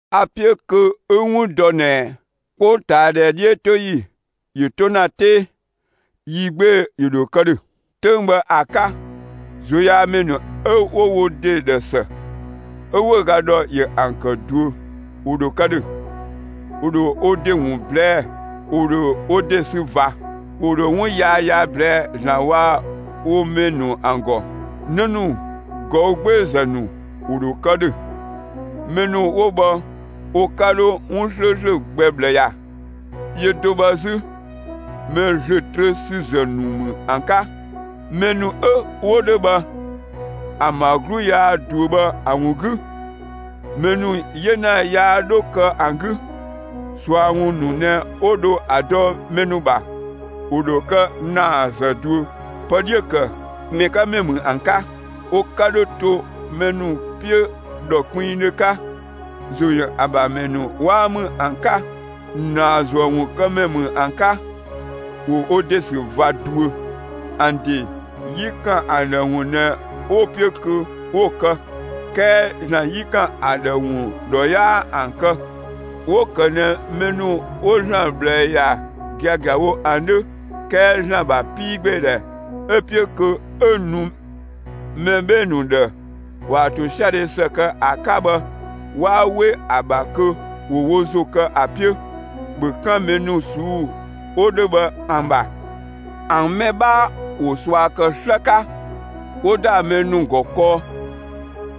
A‑ 'piö kö 'ü‑ 'wun dɔ ꞊nɛ 'kpongtaadhɛ 'dhiötoyi ‑yö 'to ‑na 'tee, yi 'gbee‑ ‑yö ‑dho kë ‑dhö. 'Töng bhë ‑a 'ka, ꞊zuöyaamɛ ‑nu 'ö 'wo wo ‑de ‑dhë ‑së, 'ö 'wëüga ‑dhɔ ‑yö ‑an ‑kë ꞊duö, ‑wo ‑dho kë ‑dhö. ‑Wo ‑dho wo ‑de ‑wun ꞊blɛɛ'‑; ‑wo ‑dho wo ‑de sü ꞊va; ‑wo ‑dho 'wun yaya ꞊blɛɛ'‑ ‑Zlan waa‑ wo mɛ ‑nu ‑an ‑gɔ. 'Në ‑nu ꞊gɔü' 'gbeezë ‑nu, ‑wo ‑dho kë ‑dhö. Mɛ ‑nu 'wo bhë wo 'ka 'dho 'wun 'slööslö gbɛ ꞊bhlë ‑ya; yö do bhë 'zü mɛ ‑zlö trö ‑sü ‑zë ‑nu ‑mü ‑an 'ka. Mɛ ‑nu 'ö 'wo 'dhö bhë, ‑an ‑bha 'glu yaa ꞊duö bhë ‑a ‑wun 'gü, mɛ ‑nu 'yena yaa 'dhö kë ‑an 'gü. ꞊Sua ‑wun ‑nu ꞊nɛ 'wo 'dho ‑a dɔ mɛ ‑nu ‑bha; ‑wo ‑dho kë ꞊naazë ꞊duö, pë 'dhiö‑ ‑kë mɛ 'ka ‑mɛ ‑mü ‑an 'ka. Wo 'ka 'dhö to mɛ ‑nu 'piö ‑dhɔ kpinngdhö 'ka; ‑zo ‑yö ‑an ‑bha ‑mɛ ‑nu 'waa ‑mü ‑an 'ka; ‑naazuëwunkëmɛ ‑mü ‑an 'ka. ‑Wo wo ‑de ‑sü ꞊va ꞊duö. ‑An ‑de 'yi ‑kan ‑an ‑dhë ‑wun ꞊nɛ 'wo‑ 'piö kö 'wo‑ kë, 'kɛɛ ‑Zlan 'yi ‑kan ‑a ‑dhë ‑wun ‑dhɔ 'yaa ‑an kë. 'Wo‑ ‑kë ꞊nɛ mɛ ‑nu 'wo ‑Zlan ꞊bhlë ‑ya giagiawo ‑an 'dhö, 'kɛɛ ‑Zlan ‑bha 'piigbeedhɛ ('ö‑ 'piö kö 'ö‑ nu mɛ 'bhee‑ ‑nu ‑dhë ‑waan ‑tosiadhe ‑së kë ‑a 'ka) bhë, 'waa 'we ‑a ‑bha kö ‑wo wo ‑zo kë ‑a 'piö. ‑Bhö 'kan mɛ ‑nu ꞊suu'‑ 'wo 'dhö bhë ‑an ‑bha! ‑An mɛ 'bhaa ‑wo ꞊sua ‑kë 'slë 'ka, 'wo ‑da mɛ ‑nu ‑gɔ kɔɔ,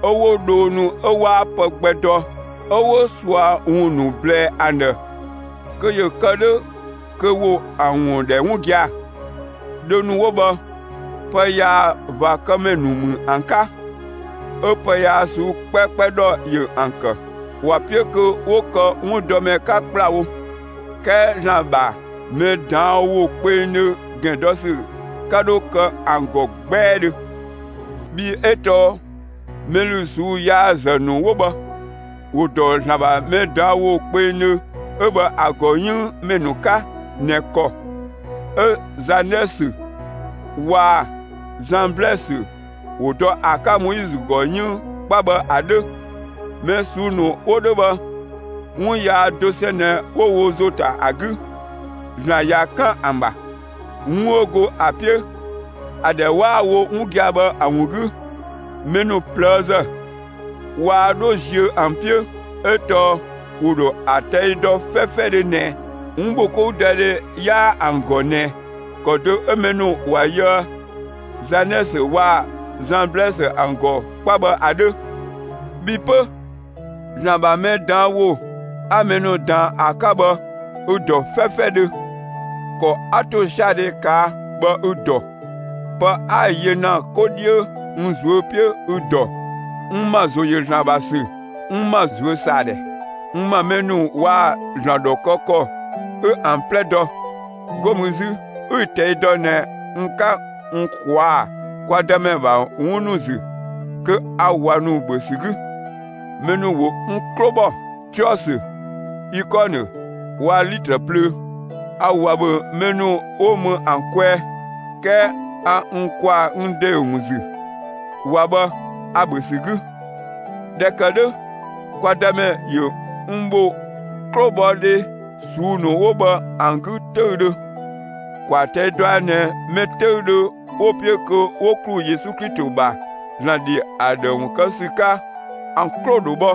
'ö 'wo dhoo ‑nu 'ö 'waa pë gbɛ dɔ, 'ö 'wo ꞊sua ‑wun ‑nu ꞊blɛɛ ‑an ‑dhë kö ‑yö kë 'dhö kö ‑wo ‑an ‑wun ‑dhɛ 'wun gia‑. Dhoo ‑nu 'wo bhë, pë yaa ꞊va kë ‑mɛ ‑nu ‑mü ‑an 'ka; 'ö pë yaa ꞊suu'‑ 'kpɛkpɛ ‑dhɔ ‑yö ‑an ‑kë. ‑Wa 'piö kö 'wo kë 'wundɔmɛ 'ka ‑kplawo, 'kɛɛ ‑Zlan ‑bha mɛ ꞊daan' ‑wo kpengdhö ‑gɛn dɔ ‑sü 'ka 'dho kë ‑an ‑gɔ 'gbɛɛdhö. Bhii 'ö tɔɔ mɛ ‑lü ꞊suu'‑ yaa‑ ‑zë ‑nu 'wo bhë, ‑wo ‑dɔ ‑Zlan ‑bha mɛ ꞊daan' ‑wo kpengdhö 'ö bhë ‑a ‑gɔ 'yënng mɛ ‑nu 'ka ꞊nɛ ‑kɔ 'ö Zanɛsö waa‑ Zamblɛsö 'wo dɔ ‑a 'ka Moizö ‑gɔ 'yënng 'kpa bhë ‑a 'dhö. Mɛ ꞊suu'‑ ‑nu 'wo 'dhö bhë 'wun yaa dosɛn ꞊nɛ 'wo wo ‑zo ‑ta ‑a 'gü. ‑Zlan ꞊ya 'kan ‑an ‑bha, 'wun 'ö go ‑a 'piö ‑a ‑dhɛ 'waa‑ wo 'wun gia‑ bhë ‑a ‑wun 'gü. Mɛ ‑nu ꞊plëëzë, waa 'dho ziö ‑an 'piö, 'ö tɔɔ ‑wo ‑dho ‑a ꞊tɛi' dɔ 'fɛfɛdhö ꞊nɛ, 'wunbhokoudɔdhe 'yaa ‑an ‑gɔ ꞊nɛ, ‑kɔ do 'ö mɛ ‑nu ‑wa yöë Zanɛsö waa‑ Zamblɛsö ‑an ‑gɔ 'kpa bhë ‑a 'dhö. Bhi 'pö, ‑Zlan ‑bha mɛ ꞊daan' ‑wo 'a mɛ ‑nu ꞊daan ‑a 'ka bhë, ü‑ ‑dɔ 'fɛfɛdhö. ‑Kɔ 'a ‑tosiadhe ꞊kaa' bhë 'ü‑ dɔ. Pë 'a‑ yö ‑na 'ko 'dhiö n ꞊zuö' 'piö 'ü‑ dɔ. N ‑ma ‑zo ‑yö ‑Zlan ‑bha ‑sü, n ‑ma ꞊zuösaadhɛ, n ‑ma mɛ ‑nu waa‑ ‑Zlan ‑dhɔ kë ‑kɔ 'ü ‑an 'plɛ dɔ. 'Go mü 'zü 'ü‑ ꞊tɛi' dɔ ꞊nɛ n 'ka n ꞊kwaa'‑ kwa Dëmɛ ‑bha 'wun ‑nu ‑zü kö a ꞊wa ‑nu ‑bhö ‑sü 'gü. Mɛ ‑nu ‑wo n 'klo ‑bhɔ Tiɔsö, Ikɔnë waa‑ Litrë plöö: A ꞊wa ‑bhö mɛ ‑nu 'wo mü ‑an kwɛɛ, 'kɛɛ a n ‑kwaa n ‑de ‑wun ‑zü, ꞊wa bhë ‑a ‑bhö ‑sü 'gü. ꞊Dhɛ ‑kë 'dhö, kwa Dëmɛ ‑yö n ‑bho 'klobhɔdhe ꞊suu'‑ ‑nu 'wo bhë ‑an 'gü 'töüdhö. ‑Kwaa ꞊tɛi' dɔa ꞊nɛ mɛ 'töüdhö 'wo‑ 'piö kö ‑wo ‑klu Yesu Klito ‑bha ‑Zlan ‑dhi ‑a ‑dhë ‑wun kë ‑sü 'ka, ‑an 'klo ‑dho bhɔ.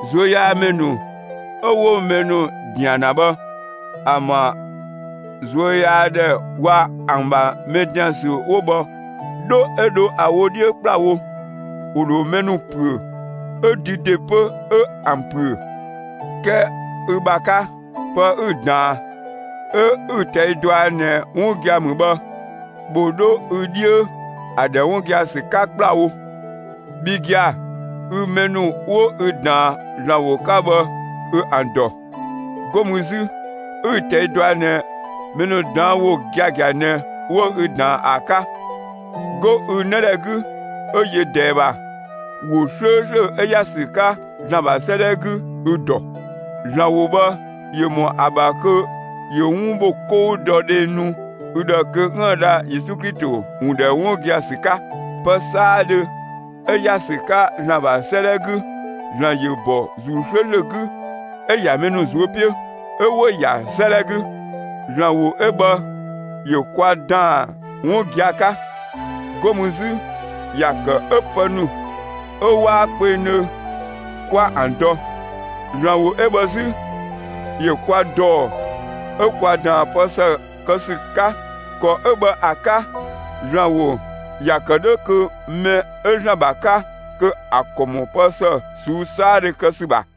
꞊Zuöyaamɛ ‑nu 'ö 'wo mɛ ‑nu ‑dian ‑na bhë ‑an ‑bha ꞊zuöyaadhɛ waa‑ ‑an ‑bha mɛ ‑dian ‑sü 'wo bhë 'dho 'ö dho ‑a wo 'dhiö ‑kplawo. ‑Wo ‑dho mɛ ‑nu ‑püö, 'ö dü ‑de 'pö 'ö ‑an ‑püö. 'Kɛɛ ü ‑bha 'ka, pë 'ü‑ ꞊daan, 'ö 'ü‑ ꞊tɛi' dɔa ꞊nɛ 'wun gia‑ ‑mü bhë, ‑bhö 'dho ü 'dhiö, ‑a ‑dhɛ 'wun gia‑ ‑sü 'ka ‑kplawo! Bhi gia‑, ü mɛ ‑nu 'wo ü ꞊daan ‑Zlan ‑wo 'ka bhë, 'ü ‑an ‑dɔ. ('Go mü 'zü 'ü‑ ꞊tɛi' dɔa ꞊nɛ mɛ ꞊daan' ‑wo giagia ꞊nɛ 'wo ü ꞊daan ‑a 'ka.) 'Go ü 'nëdhɛ 'gü 'ö yö ꞊dɛɛ ‑bha, ‑wo 'slööslö 'ö ‑ya ‑sü 'ka ‑Zlan ‑bha 'sëëdhɛ 'gü, ü‑ ‑dɔ. ‑Zlan ‑wo bhë ‑yö ‑mɔ ‑a ‑bha kö ‑yö 'wun ‑bho 'kɔu dɔ dhe nu ü ‑dhë kö 'üën‑ dha Yesu Klito ‑wun ‑dhɛ 'wun gia‑ ‑sü 'ka. Pë 'saadhö 'ö ‑ya ‑sü 'ka ‑Zlan ‑bha 'sëëdhɛ 'gü, ‑Zlan ‑yö ‑bɔ ‑Zuu 'slööslö 'gü 'ö‑ ‑ya mɛ ‑nu ꞊zuö' 'piö, 'ö 'wo‑ ‑ya 'sëëdhɛ 'gü. ‑Zlan ‑wo 'ö bhë ‑yö kwa ‑daan 'wun gia‑ 'ka. 'Go mü 'zü ‑ya ‑kë 'ö pë ‑nu 'ö 'waa kpengdhö 'kwa ‑an dɔ. ‑Zlan ‑wo 'ö bhë 'zü, ‑yö kwa ‑dɔɔ 'ö kwa ꞊daan pë ‑së kë ‑sü 'ka. ‑Kɔ 'ö bhë ‑a 'ka, ‑Zlan ‑wo ‑ya ‑kë 'dhö kö mɛ 'ö ‑Zlan ‑bha 'ka, kö ‑a ‑kɔ ‑mɔ pë ‑së ꞊suu'‑ 'saadhö kë ‑sü ‑bha.